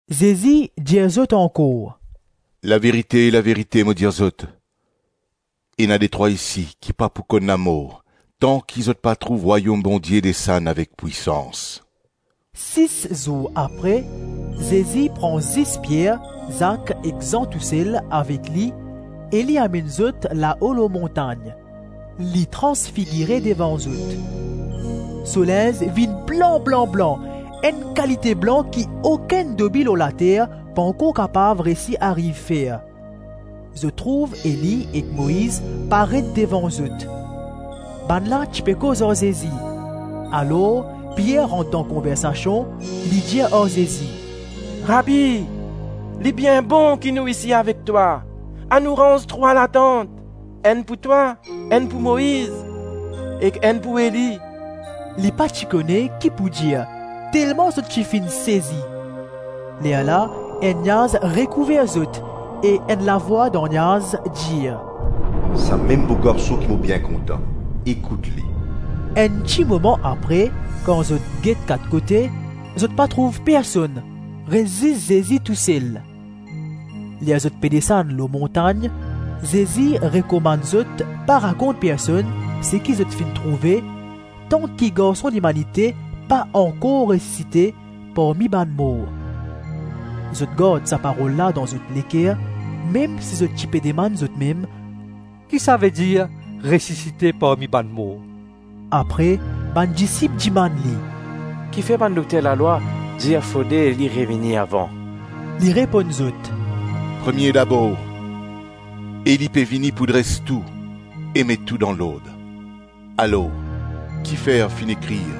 Zezi dir zot ankor, “Laverite, laverite mo dir zot, ena detrwa isi ki pa pou konn lamor tanki zot pa trouv Rwayom Bondie desann avek pwisans.” Sis zour apre, Zezi pran zis Pier, Zak ek Zan tousel avek li e li amenn zot lao lor montagn. Li transfigire devan zot. So linz vinn blan-blan-blan, enn kalite blan ki okenn dobi lor later pankor kapav reysi ariv fer. Zot trouv Eli ek Moiz paret devan zot. Bannla ti pe koz ar Zezi. Alor Pier rant dan konversasion, li dir ar Zezi, “Rabi, li bien bon ki nou isi avek twa; anou ranz trwa latant, enn pou twa, enn pou Moiz ek enn pou Eli.” Li pa ti kone ki pou dir telman zot ti finn sezi. Lerla enn niaz rekouver zot e enn lavwa dan niaz dir, “Samem mo Garson ki mo bien kontan, ekout li.” Enn ti moman apre, kan zot get kat kote, zot pa trouv personn, res zis Zezi tousel. Ler zot pe desann lor montagn, Zezi rekomann zot pa rakont personn seki zot finn trouve tanki Garson Limanite pa ankor resisite parmi bann mor. Zot gard sa parol la dan zot leker, mem si zot ti pe dimann zotmem, “Ki savedir ‘Resisite parmi bann mor’?” Apre bann disip dimann li, “Kifer bann dokter lalwa dir fode Eli revini avan?” Li reponn zot, “Premie dabor, Eli pe vini pou dres tou e met tou dan lord; alor kifer finn ekrir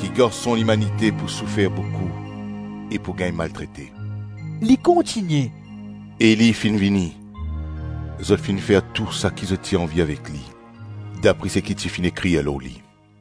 ki Garson Limanite pou soufer boukou e pou gagn maltrete?” Li kontigne, “Eli finn vini, zot finn fer tou saki zot ti anvi avek li, dapre seki ti finn ekrir lor li.”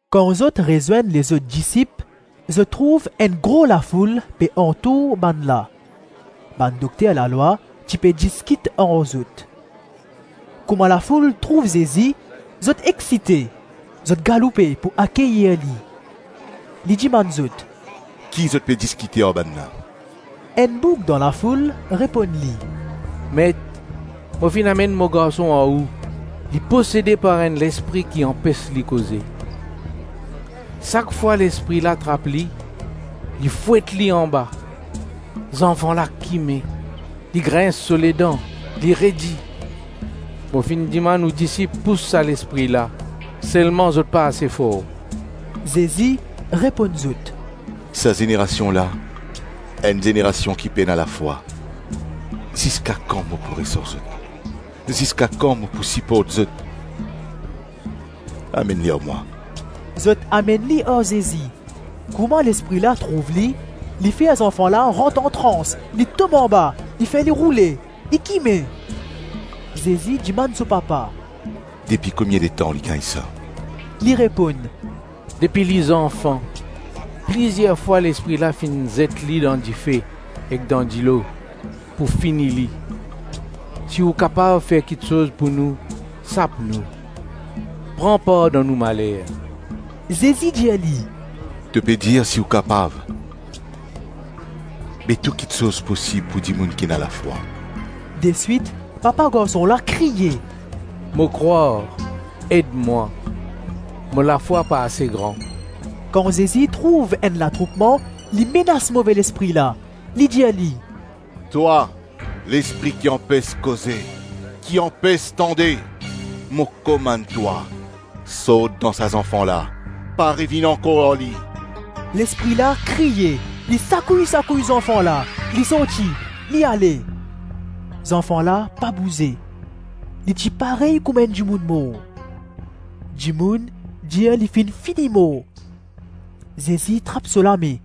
Kan zot rezwenn lezot disip, zot trouv enn gro lafoul pe antour bannla; bann dokter lalwa ti pe diskit ar zot. Kouma lafoul trouv Zezi, zot exsite. Zot galoupe pou akeyir li. Li dimann zot, “Ki zot pe diskite ar bannla?” Enn boug dan lafoul reponn li, “Met, mo finn amenn mo garson ar ou, li posede par enn lespri ki anpes li koze. Sak fwa lespri la trap li, li fwet li anba, zanfan la kime, li grins so ledan, li redi. Mo finn dimann ou disip pous sa lespri la, selman zot pa ase for.” Zezi reponn zot, “Sa zenerasion la, enn zenerasion ki pena lafwa; ziska kan mo pou res ar zot? Ziska kan mo pou siport zot? Amenn li ar mwa.” Zot amenn li ar Zezi; kouma lespri la trouv li, li fer zanfan la rant antrans, li tom anba, li fer li roule, li kime. Zezi dimann so papa, “Depi komie letan li gagn sa?” Li reponn, “Depi li zanfan. Plizir fwa, lespri la finn zet li dan dife ek dan dilo pou fini li; si ou kapav fer kiksoz pou nou, sap nou, pran par dan nou maler.” Zezi dir li, “To pe dir si ou kapav? Be tou kiksoz posib pou dimoun ki ena lafwa.” Deswit papa garson la kriye, “Mo krwar; ed mwa, mo lafwa pa ase gran.” Kan Zezi trouv enn latroupman, li menas move lespri la, li dir li, “Twa, lespri ki anpes koze, ki anpes tande, mo komann twa, sort dan sa zanfan la, pa revinn ankor ar li.” Lespri la kriye, li sakouy-sakouy zanfan la, li sorti, li ale. Zanfan la pa bouze, li ti parey kouma enn dimoun mor. Dimoun dir li finn fini mor. Zezi trap so lame,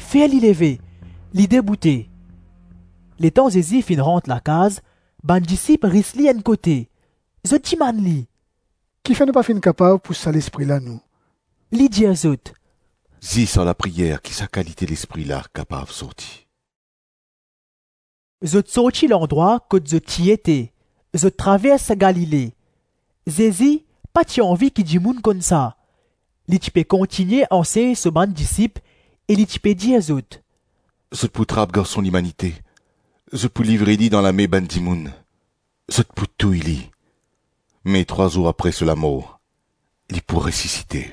fer li leve, li deboute. Letan Zezi finn rant lakaz, bann disip ris li enn kote, zot dimann li, “Kifer nou pa finn kapav pous sa lespri la, nou?” Li dir zot, “Zis ar lapriyer ki sa kalite lespri la kapav sorti.” Zot sorti landrwa kot zot ti ete, zot travers Galile. Zezi pa ti anvi ki dimoun konn sa. Li ti pe kontigne ansegn so bann disip e li ti pe dir zot, “Zot pou trap Garson Limanite, zot pou livre li dan lame bann dimoun; zot pou touy li, me trwa zour apre so lamor, li pou resisite.”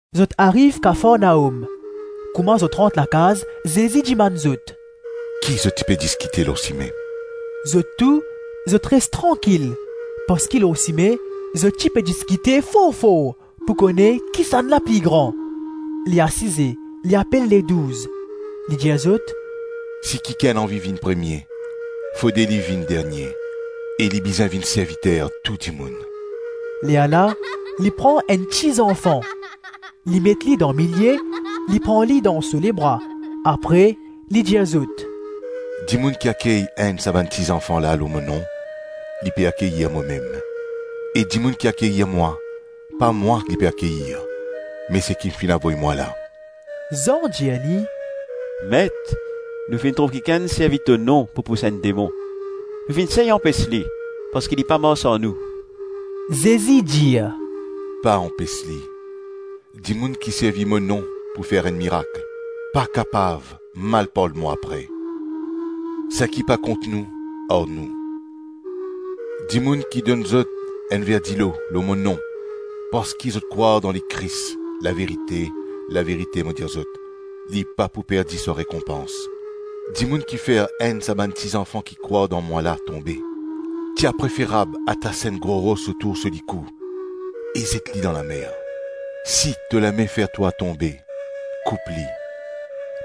Zot ariv Kafarnaom; kouma zot rant lakaz, Zezi dimann zot, “Ki zot ti pe diskite lor sime?” Zot tou, zot res trankil parski lor sime, zot ti pe diskite for-for pou kone kisannla pli gran. Li asize, li apel Ledouz, li dir zot, “Si kikenn anvi vinn premie, fode li vinn dernie e li bizin vinn serviter tou dimoun.” Lerla li pran enn ti zanfan, li met li dan milie, li pran li dan so lebra, apre li dir zot, “Dimoun ki akey enn sa bann ti zanfan la, lor mo nom, li pe akeyir momem; e dimoun ki akeyir mwa, pa mwa li pe akeyir me seki finn avoy mwa la.” Zan dir li, “Met, nou finn trouv kikenn servi to nom pou pous enn demon; nou finn sey anpes li parski li pa mars ar nou.” Zezi dir, “Pa anpes li; dimoun ki servi mo nom pou fer enn mirak, pa kapav mal parl mwa apre; Saki pa kont nou, ar nou. Dimoun ki donn zot enn ver dilo, lor mo nom, parski zot krwar dan Lekris, laverite, laverite mo dir zot, li pa pou perdi so rekonpans.” “Dimoun ki fer enn sa bann ti zanfan ki krwar dan mwa la tonbe, ti a preferab atas enn gro ros otour so likou e zet li dan lamer. Si to lame fer twa tonbe, koup li;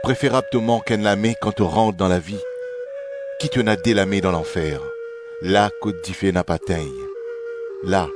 preferab to mank enn lame kan to rant dan lavi, ki to ena de lame dan lanfer, la kot dife napa tegn. [La,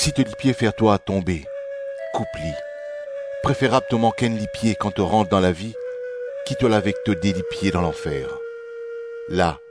Si to lipie fer twa tonbe, koup li; preferab to mank enn lipie kan to rant dan lavi, ki to al avek to de lipie dan lanfer. [La,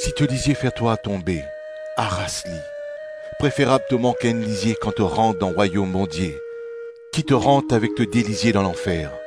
Si to lizie fer twa tonbe, aras li; preferab to mank enn lizie kan to rant dan Rwayom Bondie, ki to rant avek to de lizie dan lanfer,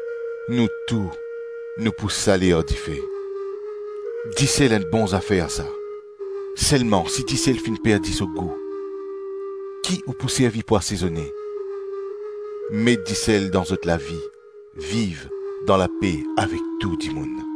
Nou tou, nou pou sale ar dife. Disel enn bon zafer, sa, selman si disel finn perdi so gou, ki ou pou servi pou asezone? Met disel dan zot lavi, viv dan lape avek tou dimoun.”